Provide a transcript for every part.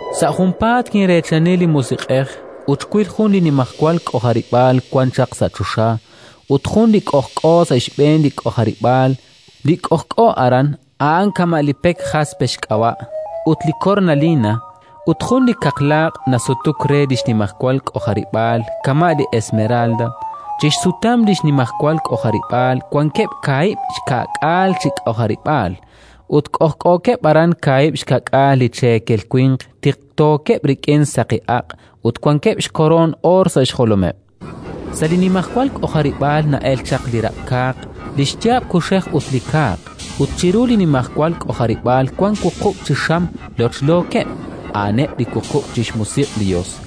Sa' junpaat kinreechani li Musiq'ej, ut xwil jun li nimajwal k'ojarib'aal wan chaq sa' choxa, ut jun li k'ojk'o sa' xb'een li k'ojarib'aal. A'an li Qaawa' Yos. Li k'ojk'o aran, a'an kama' li pek jaspe xk'ab'a' ut li kornalina; ut jun li kaqlaaq' nasutuk re li xnimajwal k'ojarib'aal kama' li esmeralda. Chi xsutam li nimajwal k'ojarib'aal wankeb' kaahib' xka'k'aal chi k'ojarib'aal, ut k'ojk'ookeb' aran kaahib' xka'k'aal li cheekel winq tiqtookeb' rik'in saqi aq', ut wankeb' xkoroon oor sa' xjolomeb'. Sa' li nimajwal k'ojarib'aal na'elk chaq li raq'kaaq, li xyaab' kuxej ut li kaaq; ut chiru li nimajwal k'ojarib'aal wank wuqub' chi xam lochlookeb', a'aneb' li wuqub' chi xmusiq' li Yos.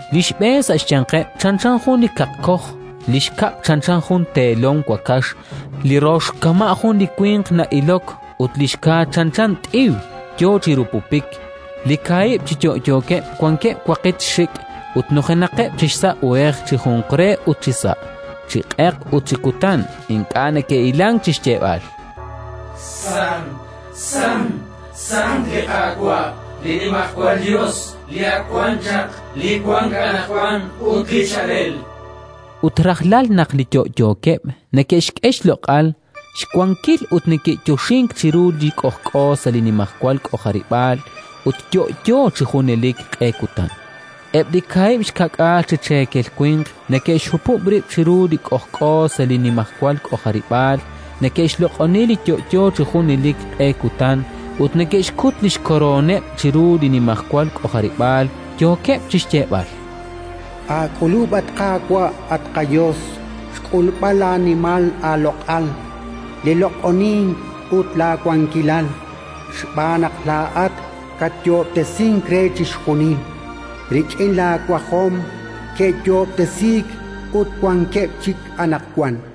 Li xb'een sa' xyanqeb' chanchan jun li kaqkoj, li xkab' chanchan jun teelom wakax, li rox kama' jun li winq na'ilok ut li xka chanchan t'iw yo chi rupupik. Li kaahib' chi yo'yookeb' wankeb' waqitq xik' ut nujenaqeb' chi xsa' uhej chi junqre ut chisa'; chi q'eq ut chi kutan ink'a' neke'hilank chi xyeeb'al: “Sant, Sant, Sant li Qaawa', li Nimajwal Yos, li ak wan chaq, li wank anaqwan ut li chaalel”. Ut rajlal naq li yo'yookeb' neke'xk'e xloq'al, xwankil ut neke'yoxink chiru li k'ojk'o sa' li nimajwal k'ojarib'aal ut yo'yo chi junelik q'e kutan, eb' li kaahib' xka'k'aal chi cheekel winq neke'xhupub' rib' chiru li k'ojk'o sa' li nimajwal k'ojarib'aal, neke'xloq'oni li yo'yo chi junelik q'e kutan ut neke'xkut li xkorooneb' chiru li nimajwal k'ojarib'aal, yookeb' chi xyeeb'al: “Aak'ulub', at Qaawa', at qaYos, xk'ulb'al laanimal laaloq'al, li loq'onink ut laawankilal, xb'aan naq laa'at katyoob'tesink re chixjunil: rik'in laawajom ke'yoob'tesiik ut wankeb' chik anaqwan”.